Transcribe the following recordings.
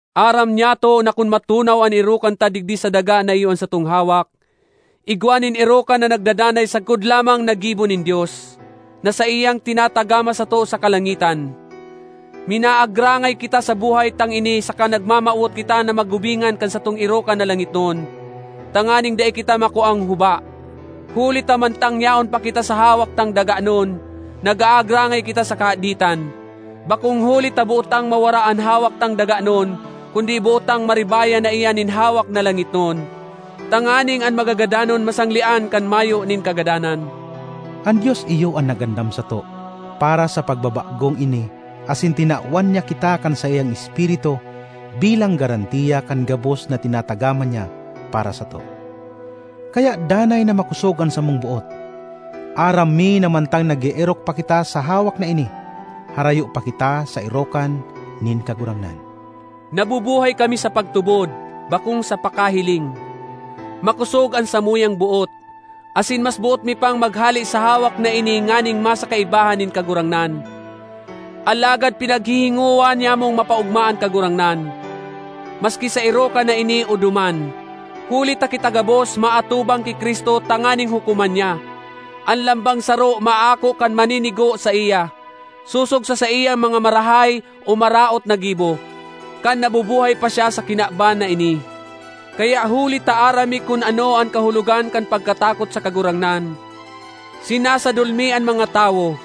Aram nyato na kun matunaw an erokan ta digdi sa daga na iyo an satong hawak, igwa nin erokan na nagdadanay sagkod lamang na gibo nin Dios, na saiyang tinatagama sato sa kalangitan. Minaagrangay kita sa buhay tang ini saka nagmamawot kita na magubingan kan satong erokan na langitnon, tanganing dai kita makuang huba. Huli ta mantang yaon pa kita sa hawak tang daganon, nag-aagrangay kita sa kahaditan. Bakong huli ta boot tang mawara an hawak tang daganon, kundi boot tang maribayan na iyan nin hawak na langitnon, tanganing an magagadanon masanglean kan mayo nin kagadanan. An Dios iyo an nag-andam sato para sa pagbabagong ini asin tinawan niya kita kan saiyang Espiritu bilang garantiya kan gabos na tinatagama niya para sato. Kaya danay na makosog an samong boot. Aram mi na mantang nag-eerok pa kita sa hawak na ini, harayo pa kita sa erokan nin Kagurangnan. Nabubuhay kami sa pagtubod, bakong sa pakahiling. Makosog an samuyang boot; asin mas boot mi pang maghale sa hawak na ini nganing masa kaibahan nin Kagurangnan. Alagad pinaghihingowa nyamong mapaogma an Kagurangnan, maski sa erokan na ini o duman. Huli ta kita gabos maatubang ki Cristo tanganing hukoman niya. An lambang saro maako kan maninigo saiya, sosog sa saiyang mga marahay o maraot na gibo, kan nabubuhay pa siya sa kinaban na ini. Kaya huli ta aram mi kun ano an kahulogan kan pagkatakot sa Kagurangnan, sinasadol mi an mga tawo.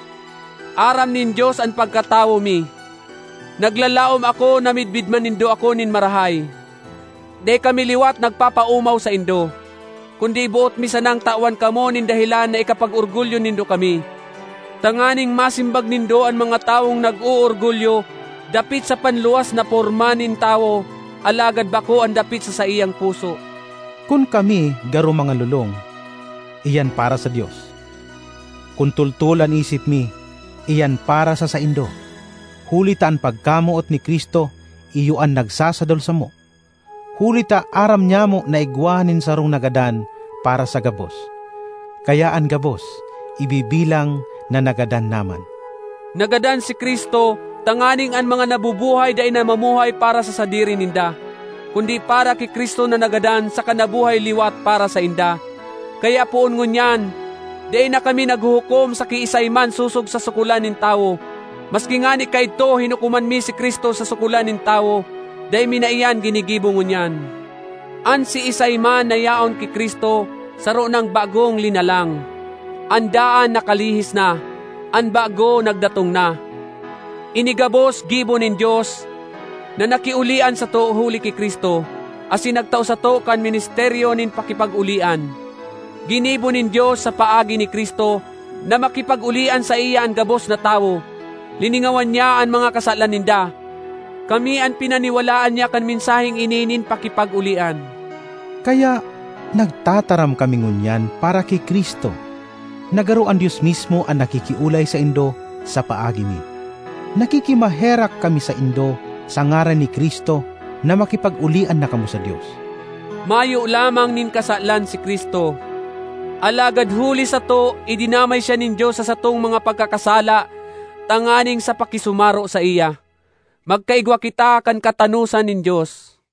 Aram nin Dios an pagkatawo mi; naglalaom ako na midbid man nindo ako nin marahay. Dai kami liwat nagpapaomaw saindo, kundi boot mi sanang tawan kamo nin dahelan na ikapag-orgulyo nindo kami, tanganing masimbag nindo an mga tawong nag-oorgulyo dapit sa panluwas na porma nin tawo alagad bako an dapit sa saiyang puso. Kun kami garo mga lolong, iyan para sa Dios. Kun toltol an isip mi, iyan para sa saindo. Huli ta an pagkamoot ni Cristo iyo an nagsasadol samo, huli ta aram nyamo na igwa nin sarong nagadan para sa gabos; kaya an gabos ibibilang na nagadan na man. Nagadan si Cristo tanganing an mga nabubuhay dai na mamuhay para sa sadiri ninda, kundi para ki Cristo na nagadan saka nabuhay liwat para sainda. Kaya poon ngunyan, dai na kami naghuhukom sa kiisay man sosog sa sukolan nin tawo. Maski ngani kaidto hinukoman mi si Cristo sa sukolan nin tawo, dai mi na iyan ginigibo ngunyan. An siisay man na yaon ki Cristo, saro nang bagong linalang; an daan nakalihis na, an bago nagdatong na. Ini gabos gibo nin Dios, na nakiolian sato huli ki Cristo, asin nagtao sato kan ministeryo nin pakipag-olian. Ginibo nin Dios, sa paagi ni Cristo, na makipag-olian saiya an gabos na tawo; liningawan niya an mga kasalan ninda. Kami an pinaniwalaan niya kan mensaheng ini nin pakipag-olian. Kaya, nagtataram kami ngunyan para ki Cristo na garo an Dios mismo an nakikiolay saindo sa paagi mi. Nakikimaherak kami saindo sa ngaran ni Cristo na makipag-olian na kamo sa Dios. Mayo lamang nin kasalan si Cristo, alagad huli sato idinamay siya nin Dios sa satong mga pagkakasala tanganing sa pakisumaro saiya, magkaigwa kita kan katanosan nin Dios.